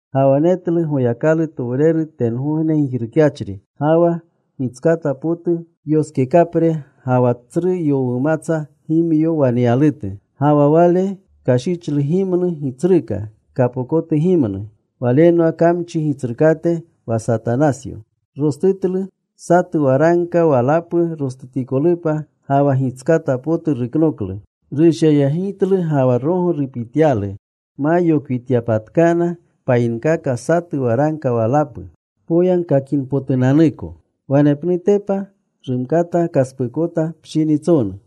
Ga wa netlu Goyakalutowreru tengogne gijrukyachri. Ga wa gitskata potu yoskekapre ga wa tsru yowumatsa gimyo waneyalutu. Ga wa wale kashichlu gimnu gitsruka, kapokotu gimnu. Walenwa kamchi gitsrukate, wa Satanasyo. Rostutlu. Satu waragka walapu rostutikolupa. Ga wa gitskata potu ruknoklu. Rushyayegitlu ga wa rogo rupityalu, ma yokwityapatkana payinkaka, satu waragka walapu poyagkakinpotunanuko. Wanepnutepa rumkata kaspuukota pshinitsonu.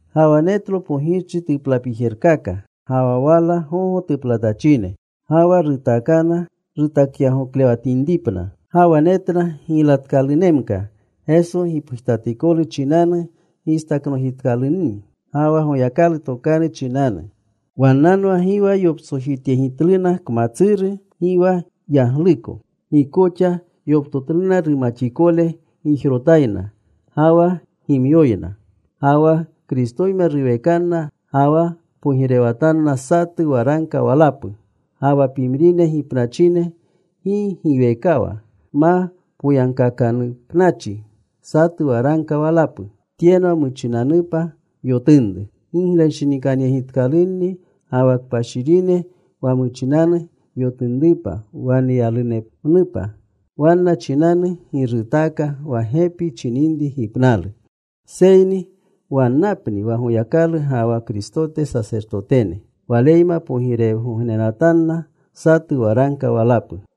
Ga wa netlo pogirchi tuplapijerkaka, ga wa wala gogo tuplatachine. Ga wa rutaakana rutakyagoklewatinripna. Ga wa netna giylatkalunemka, Geso gipgujtatikolu chinanu gistaknojitkalunni ga wa Goyakalu Tokanu chinanu. Wannanwa gi wa yoptsojityegitluna kmatsuru, gi wa yagluko. Gi koxa yoptotluna rumaxikole gijrotayna ga wa gimyoyna. Ga wa Kristoyma ruwekanna ga wa pogirewatanna satu waragka walapu. Ga wa pimrine gipnachine gi giwekawa ma poyagkaakanupachi satu waragka walapu. Tyenwa muchinanupa yotunru. Giglenshinikanyegitkalunni ga wa kpashirine wa muchinanu yotunrupa waneyalunemnupa. Wanna chinanu gi rutaaka wa gepi chininri gipnalu. Seyni wannapni wa Goyakalu ga wa Kristote sasertotetene. Waleyma pogirewgognenatanna satu waragka walapu.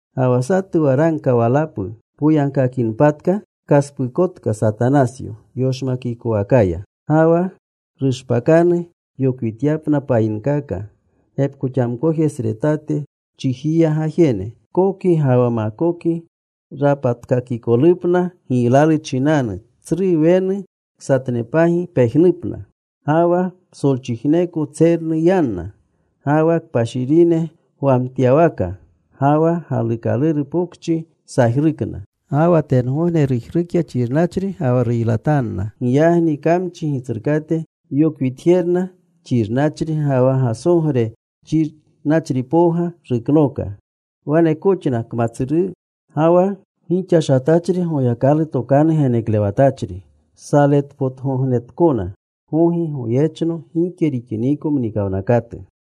Ga wa satu waragka walapu poyagkakinpatka, kaspuukotka Satanasyo yoshmakikowakaya. Ga wa rushpakanu yokwityapna payinkaka, gepkoxamkojesretate chijiya gajene, Koki ga wa Makoki, rapatkakikolupna giylalu chinanu. Tsru wenu ksatnepagi pejnupna. Ga wa psolchijneko tsernu yanna. Ga wa kpashirine gwamtyawaka ga wa galuukaluru pokchi sajrukna. Ga wa tengogne rujrukya xirnachri ga wa ruylatanna. Giyagni kamchi gitsrukate yokwitjerna, xirnachri ga wa gasogre xirnachripowga ruknooka. Wanekoxna kmatsuru ga wa gixashatachri Goyakalu Tokanu geneklewatachri. Saletpotgognenatkona gogi goyechno gike rixiniko mnikawnakatu.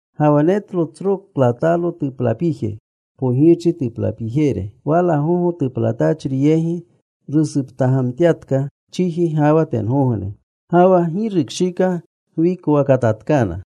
Ga wa netlo tsro klatalo tuplapije, pogirchi tuplapijere. Wala gogo tuplatachri yegi rusuptagamtyatka chiji ga wa tengogne. Ga wa gi rukshika gwikowakatatkana.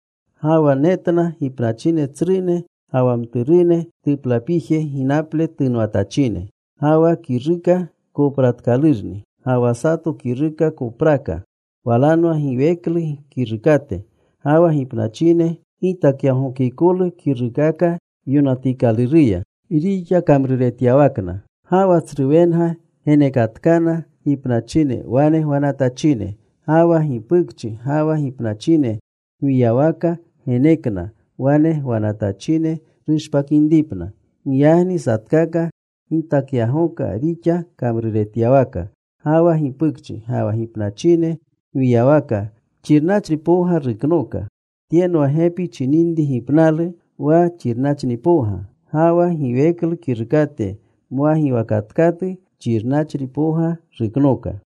Ga wa netna gipnachine tsrune ga wa mturune tuplapije ginaple tunwatachine. Ga wa kiruukaka kopraakalurni. Ga wa sato kiruka kopraaka. Walanwa giweklu kirukate. Ga wa gipnachine gitakyagookikolu kiruukaka yonatikaluruya, rixa kamruretyawakna. Ga wa tsru wenga genekatkana gipnachine wane gwanatachine. Ga wa gipukchi ga wa gipnachine gwiyawaka genekna wane gwanatachine rushpakinripna. Giyagni satkaka gitakyagooka rixa kamruretyawaka. Ga wa gipukchi ga wa gipnachine gwiyawaka xirnachripowga ruknooka. Tyenwa gepi chininri gipnalu, wa xirnachripowga. Ga wa giweklu kirukate mwagiwaakatkatu xirnachripowga ruknooka.